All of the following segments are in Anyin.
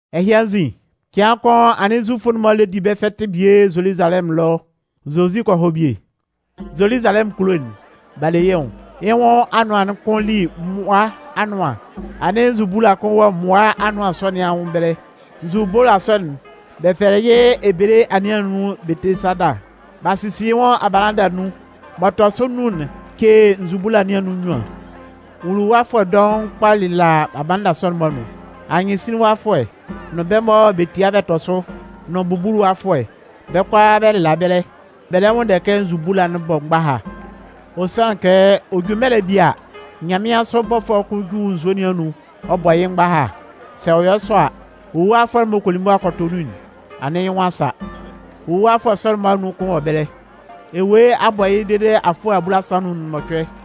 Ɛhɩ anzin, cɩan kʋn anɩn Zufʋ'n-mɔ lɛ di bɛ́ fɛtɩ bie Zoluzalɛmʋn ɛlɔ. Zozi kɔ hɔ bie. Zoluzalɛmʋn kulo'n, b'a le yɩ́ nwʋn. Yɩ́ nwʋn anʋan'n kʋn li Mmʋa Anʋan. Anɩn nzubula kʋn wɔ mmʋa anʋan sɔ nɩn anwʋn ɛbɛlɛ. Nzubula sɔ'n bɛ fɛlɛ yɩ́ ebele anɩɛ nɩn anun Betesada. B'a sisi yɩ́ nwʋn abalanda nnun (m'ɔ tɔ sʋ nnun'n ce nzubula nɩn anun nnyuan). Nwuluwafʋɛ dɔʋn kpa lɩla abalanda sɔ'n-mɔ anun. Anyɩnsinlinwafʋɛ, nʋn bɛ́ mɔ bɛ tia bɛ tɔ sʋ, nʋn bubuluwafʋɛ, bɛ́ kʋalaa bɛ lɩla ɛbɛlɛ. (Bɛ lɛ nwʋnndɛ kɛ nzubula'n bɔ́ mgbaha. Ɔ sanlɩn kɛ ɔ ju mɛlɛ'n bie a, nyanmɩansʋ bɔfʋɛ kʋn ju nzue nɩn anun ɔ bɔ yɩ́ mgbaha. Sɛ ɔ yɔ sɔ a, wuluwafʋɛ m'ɔ kɔ li mʋa kɔ tɔ nun'n, anɩn yɩ́ nwʋn a sa.) Nwuluwafʋɛ sɔ'n-mɔ anun kʋn wɔ ɛbɛlɛ, ewue a bɔ yɩ́ dede afʋɛ abulasan nʋn mɔcʋɛ.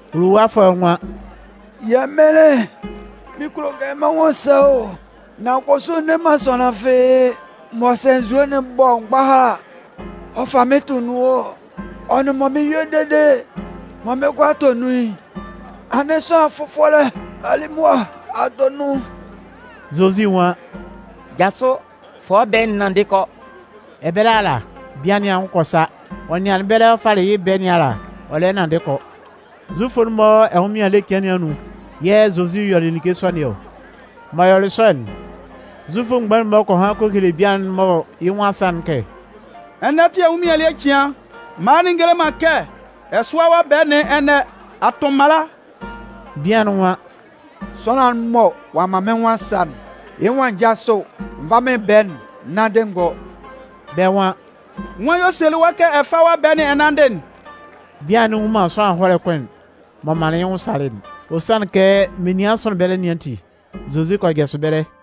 Wuluwafʋɛ'n nwan: “Yɛmɩnlɩn, mɩn kulo kɛ mɩ́n nwʋn sa o, nan kʋsʋ n ne man sʋanlan fɩ́ɩ́ mɔ sɛ nzue'n bɔ mgbaha a, ɔ fa mɩ́n tʋ nun ɔ. Ɔ nʋn mɔ mɩn 'yɔ dede mɩn 'kɔ a tɔ nun'n, anɩn sʋanlan fʋfɔlɛ a li mʋa a tɔ nun.” Zozi nwan: “Jasʋ, fa wɔ́ ɛbɛɛ'n, nanndɩ kɔ.” Ɛbɛlɛ ala, bian nɩn anwʋn kɔ sa. Ɔ nɩanlɩn ɛbɛlɛ ɔ falɩ yɩ́ ɛbɛɛ nɩn ala, ɔ lɛ nanndɩ kɔ. Zufʋ'n-mɔ ɛnwʋnmɩan ele cɩan nɩn anun yɛ̂ Zozi yɔlɩ like sɔ nɩn ɔ. M'ɔ yɔlɩ sɔ'n, Zufʋ mgbain'n-mɔ kɔ han kɔ hele bian'n mɔ yɩ́ nwʋn a sa'n kɛ: “Ɛnɛ tɩ ɛnwʋnmɩan ele cɩan, mala'n ngele man kɛ ɛ sʋ́a wɔ́ ɛbɛɛ nɩn ɛnɛ. A tʋn mala.” Bian'n nwan: “Sʋanlan'n mɔ ɔ'a man mɩ́n nwʋn a sa'n, yɩ́ nwan n jásʋ n vá mɩ́n ɛbɛɛ'n, n nánndɩ n gɔ́.” Bɛ́ nwan: “Nwan yɛ̂ ɔ selɩ wɔ́ kɛ ɛ fá wɔ́ ɛbɛɛ'n ɛ nánndɩ'n?” Bian'n nnwun man sʋanlan ɛhɔlɛ kʋn'n m'ɔ manlɩn yɩ́ nwʋn salɩ'n, ɔ sanlɩn kɛ menian sʋnlɩn ɛbɛlɛ nɩn ati, Zozi kɔ jasʋ ɛbɛlɛ.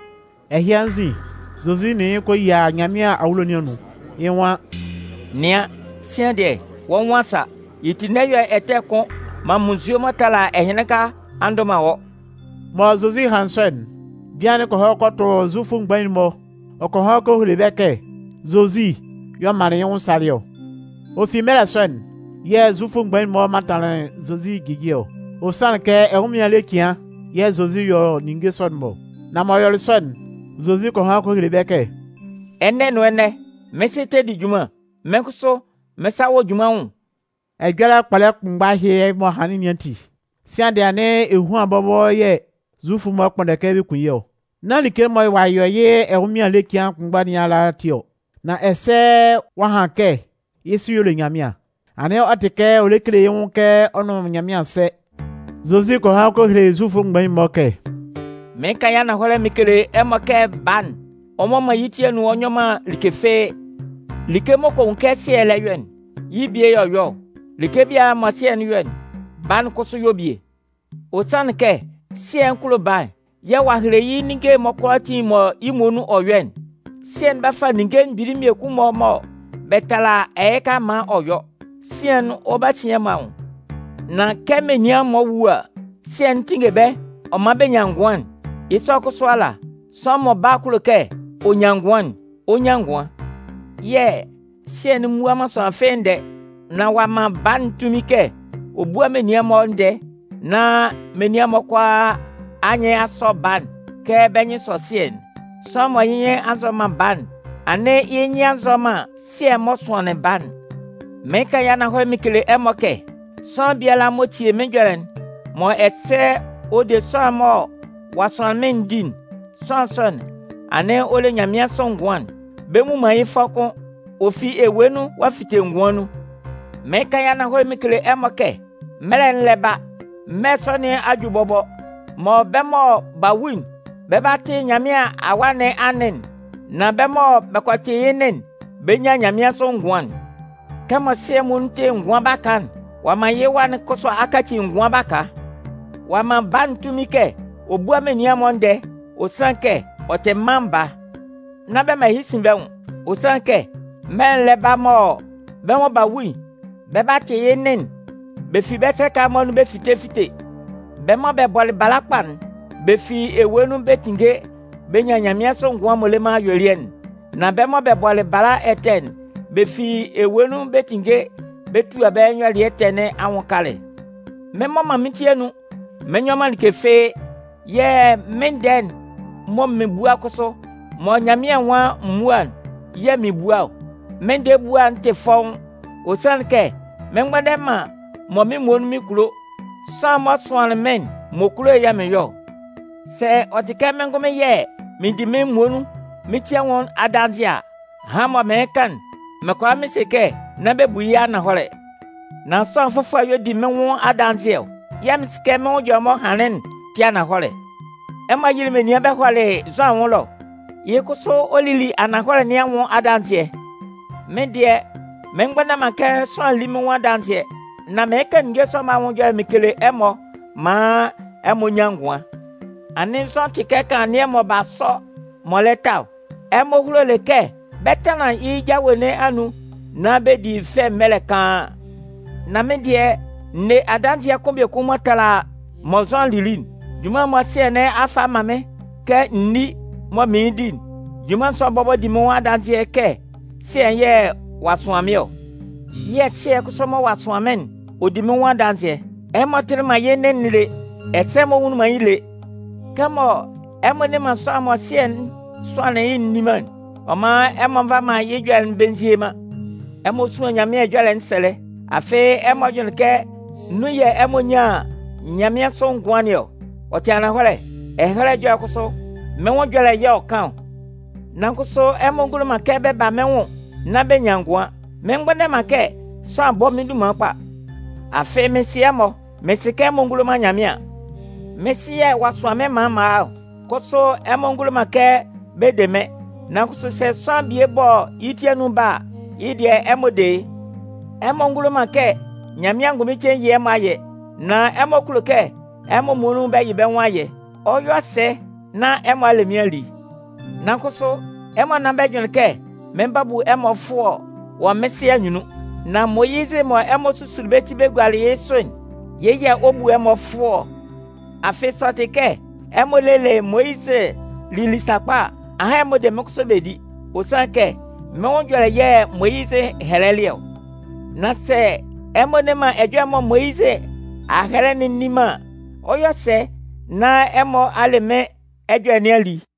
Ɛhɩ anzin, Zozi nʋn yɩ́ kɔ yia Nyanmɩan awulo nɩn anun. Yɩ́ nwan: “Nɩan, sian dɩɛ, wɔ́ nwʋn a sa, yɩ́ ti n'ɛ yɔ ɛtɛ fɩ́ɩ́ kʋ́n nán munnzue m'ɔ tala ɛhɩnlɩnka a ndʋ man wɔ́.” Mɔ Zozi hanlɩn sɔ'n, bian'n kɔ hɔ kɔ tʋ Zufʋ mgbain'n-mɔ ɔ kɔ han kɔ hele bɛ́ kɛ Zozi y'ɔ manlɩn yɩ́ nwʋn salɩ ɔ. Ɔ fi mɛlɛ sɔ'n yɛ̂ Zufʋ mgbain'n-mɔ mantanlɩn Zozi ɛjɩjɩɛ ɔ. Ɔ sanlɩn kɛ ɛnwʋnmɩan ele cɩan yɛ̂ Zozi yɔ ninnge sɔ'n-mɔ ɔ. Nan m'ɔ yɔlɩ sɔ'n, Zozi kɔ han kɔ hele bɛ́ kɛ: “Ɛnɛ nʋn ɛnɛ, mɩ́n Sɩ tɛ di junman, mɩ́n kʋsʋ, mɩ́n sa wɔ junman nwʋn.” Ɛjɔlɛ kpɔlɛ kʋnmgba ɛhɩ m'ɔ hanlɩn nɩn ati, sian dɩɛ anɩn ehuan bɔbɔ yɛ̂ Zufʋ'n-mɔ kpʋnndɛ kɛ bɛ kun yɩ́ ɔ. Nán like'n mɔ ɔ'a yɔ yɩ́ ɛnwʋnmɩan ele cɩan kʋnmgba nɩn ala ati ɔ, nan ɛsɛ ɔ'a han kɛ yɩ́ Sɩ y'ɔ le Nyanmɩan. Anɩn ɔ tɩ kɛ ɔ lɛ kele yɩ́ nwʋn kɛ ɔ nʋn Nyanmɩan sɛ. Zozi kɔ han kɔ hele Zufʋ mgbain'n-mɔ kɛ: “Mɩɩn kan yɩ́ ananhɔlɛ mɩn kele ɛmɔ kɛ Baa'n, ɔ mmɔ man yɩ́ ti anun ɔ nyɔ man like fɩ́ɩ́. Like m'ɔ kɔ nwun kɛ Sɩɛ'n lɛ yɔ'n, yɩ́ bie y'ɔ yɔ ɔ. Like biala mɔ Sɩɛ'n yɔ'n, Baa'n kʋsʋ yɔ bie. Ɔ sanlɩn kɛ Sɩɛ'n kulo Baa'n yɛ̂ ɔ'a hele yɩ́ ninnge'n-mɔ kʋalaatin mɔ yɩ́ muonun ɔ yɔ'n. Sɩɛ'n 'ba fa ninnge mgbili mmiekun-mɔ mɔ bɛ tala ɛhɩka maan ɔ yɔ. Sian'n, ɔ 'ba sin ɛmɔ anwʋn. Nan kɛ menian'n-mɔ wu a, Sɩɛ'n tinnge bɛ́ ɔ man bɛ nyan ngʋan'n, yɩ́ sɔ kʋsʋ ala, sʋanlan mɔ Baa'n kulo kɛ ɔ nyan ngʋan'n, ɔ 'nyan ngʋan. Yɛ̂ Sɩɛ'n mmua man sʋanlan fɩ́ɩ́ ndɛɛ. Nan ɔ'a man Baa'n tunmin kɛ ɔ búa menian'n-mɔ ndɛɛ nán menian'n-mɔ kʋalaa anyɩn a sɔ Baa'n kɛ bɛ́ nyɩn sɔ Sɩɛ'n. Sʋanlan mɔ yɩ́ nyɩn nzɔ man Baa'n, anɩn yɩ́ nyɩn nzɔ man Sɩɛ'n m'ɔ sʋanlɩn Baa'n. “Mɩɩn kan yɩ́ ananhɔlɛ mɩn kele ɛmɔ kɛ sʋanlan biala m'ɔ tie mɩ́n ɛjɔlɛ'n mɔ ɛsɛ ɔ de sʋanlan'n mɔ ɔ'a sʋan mɩ́n'n di'n, sʋanlan sɔ'n, anɩn ɔ le nyanmɩansʋ ngʋan'n. Bɛ mmu man yɩ́ fʋɔ kʋ́n. Ɔ fi ewue nun ɔ'a fite ngʋan nun. Mɩɩn kan yɩ́ ananhɔlɛ mɩn kele ɛmɔ kɛ mɛlɛ'n lɛ ba, mɛlɛ sɔ nɩn a ju bɔbɔ, mɔ bɛ́ mɔ b'a wu'n, bɛ 'ba tɩ Nyanmɩan Awa nɩn anɩn'n. Nan bɛ́ mɔ bɛ kɔ tɩ yɩ́ nɩn'n, bɛ 'nyan nyanmɩansʋ ngʋan'n. Kɛmɔ Sɩɛ'n muonun tɩ ngʋan baka'n, ɔ'a man yɩ́ Wa'n kʋsʋ a kaci ngʋan baka. Ɔ'a man Baa'n tunmin kɛ ɔ búa menian'n-mɔ ndɛɛ, ɔ sanlɩn kɛ ɔ tɩ Mân Baa. Nán bɛ man ɛhɩ sin bɛ́ nwʋn. Ɔ sanlɩn kɛ mɛlɛ'n lɛ ba mɔ bɛ́ mɔ b'a wu'n, bɛ 'ba tɩ yɩ́ nɩn'n bɛ fi bɛ́ sɛka'n-mɔ anun bɛ fite fite. Bɛ́ mɔ bɛ bɔlɩ bala kpa'n, bɛ fi ewue nun bɛ 'tinnge bɛ nyan nyanmɩansʋ ngʋan m'ɔ le man ayuelɩɛ'n. Nan bɛ́ mɔ bɛ bɔlɩ bala ɛtɛ'n, bɛ fi ewue nun bɛ 'tinnge bɛ tua bɛ́ nyɔlɩɛ ɛtɛ nɩn anwʋn kalɛ. Mɩn mmɔ man mɩ́n ti anun mɩn nyɔ man like fɩ́ɩ́, yɛ̂ mɩ́n ndɛɛ'n mɔ mɩn bua'n kʋsʋ, mɔ Nyanmɩan nwan m múa'n yɛ̂ mɩn 'bua ɔ. Mɩ́n ndɛɛ ebua'n tɩ fɔ́ʋ́n, ɔ sanlɩn kɛ mɩn mgbʋnndɛ man mɔ mɩ́n muonun mɩn kulo. Sʋanlan'n m'ɔ sʋanlɩn mɩ́n'n, m'ɔ kulo'n yɛ̂ mɩn yɔ ɔ. “Sɛ ɔ tɩ kɛ mɩ́n ngʋnmɩn yɛ̂ mɩɩn di mɩ́n muonun mɩ́n nwʋn adanzɩɛ a, ahan mɔ mɩɩn kan'n, mɩn kʋala mɩn se kɛ nán bɛ bu yɩ́ ananhɔlɛ. Nan sʋanlan fʋfɔlɛ y'ɔ di mɩ́n nwʋn adanzɩɛ ɔ. Yɛ̂ mɩn sɩ kɛ mɩ́n nwʋn ɛjɔlɛ'n m'ɔ hanlɩn'n tɩ ananhɔlɛ. Ɛmɔ yɩlɩ menian bɛ hɔlɩ Zʋan anwʋn ɛlɔ, yɩ́ kʋsʋ ɔ lili ananhɔlɛ nɩn anwʋn adanzɩɛ. Mɩ́n dɩɛ, mɩn mgbʋnndɛ man kɛ sʋanlan lí mɩ́n nwʋn adanzɩɛ. Nan mɩɩn kan ninnge sɔ'n-mɔ anwʋn ɛjɔlɛ mɩn kele ɛmɔ maan ɛmɔ nyan ngʋan. Anɩn Zʋan tɩ kɛ kanlannɩɛ mɔ b'a sɔ m'ɔ lɛ ta ɔ. Ɛmɔ hulolɩ kɛ bɛ 'tanlan yɩ́ jawe nɩn anun nán bɛ di fɛ mɛlɛ kaan. Nan mɩ́n dɩɛ, n ne adanzɩɛ kʋn biekun m'ɔ tala mɔ Zʋan lili'n. Junman'n mɔ Sɩɛ nɩn a fa a man mɩ́n kɛ n ní mɔ mɩɩn di'n, junman sɔ'n bɔbɔ di mɩ́n adanzɩɛ kɛ Sɩɛ'n yɛ̂ ɔ'a sʋan mɩ́n ɔ. Yɛ̂ Sɩɛ'n kʋsʋ mɔ ɔ'a sʋan mɩ́n'n, ɔ di mɩ́n nwʋn adanzɩɛ. Ɛmɔ tɩlɩ man yɩ́ nɩn'n lé, ɛsɛ ɛmɔ nwunlin man yɩ́ nwʋn lé. Kɛmɔ ɛmɔ nne man sʋanlan'n mɔ Sɩɛ'n sʋanlɩn yɩ́'n nni man'n, ɔ man ɛmɔ nva man yɩ́ ɛjɔlɛ'n bɛ nzie man. Ɛmɔ suan Nyanmɩan Ɛhɛlɛ Ɛjɔlɛ'n sɛlɛ, afɩ ɛmɔ jʋnlɩn kɛ nun yɛ̂ ɛmɔ 'nyan nyanmɩansʋ ngʋan nɩn ɔ. Ɔ tɩ ananhɔlɛ. Ɛhɛlɛ Ɛjɔlɛ'n kʋsʋ, mɩ́n nwʋn ɛjɔlɛ y'ɔ kan ɔ. Nan kʋsʋ ɛmɔ ngulo man kɛ bɛ ba mɩ́n nwʋn nán bɛ nyan ngʋan. “Mɩn mgbʋnndɛ man kɛ sʋanlan bɔ́ mɩ́n dunman kpa. Afɩ mɩn sɩ ɛmɔ, mɩn sɩ kɛ ɛmɔ ngulo man Nyanmɩan. Mɩ́n Sɩ yɛ̂ ɔ'a sʋan mɩ́n maan m'an a ɔ. Kʋsʋ ɛmɔ ngulo man kɛ bɛ de mɩ́n. Nan kʋsʋ sɛ sʋanlan bie bɔ yɩ́ ti anun ba a, yɩ́ dɩɛ ɛmɔ de yɩ́. Ɛmɔ ngulo man kɛ Nyanmɩan angʋnmɩn cein yɩ́ ɛmɔ ayɛ. Nan ɛmɔ kulo kɛ ɛmɔ muonun yɩ bɛ́ nwʋn ayɛ. Ɔ 'yɔ sɛ nán ɛmɔ a le mɩ́n a li? Nan kʋsʋ, ɛmɔ nán bɛ jʋnlɩn kɛ mɩn 'ba bu ɛmɔ fʋɔ wɔ mɩ́n Sɩ anyunnun. Nan Moyizɩ mɔ ɛmɔ a susu bɛ ti b'a gua yɩ́ sʋ'n, yɩ́ yɛ̂ ɔ 'bu ɛmɔ fʋɔ ɔ. Afɩ sɛ ɔ tɩ kɛ ɛmɔ lelɩ Moyizɩ lili sakpa a, ahan ɛmɔ 'de mɩ́n kʋsʋ bɛ di. Ɔ sanlɩn kɛ mɩ́n nwʋn ɛjɔlɛ yɛ̂ Moyizɩ hɛlɛlɩ ɔ. Nan sɛ ɛmɔ nne man ɛjɔlɛ'n mɔ Moyizɩ a hɛlɛ'n nni man an, ɔ 'yɔ sɛ nán ɛmɔ a le mɩ́n ɛjɔlɛ nɩn a li?”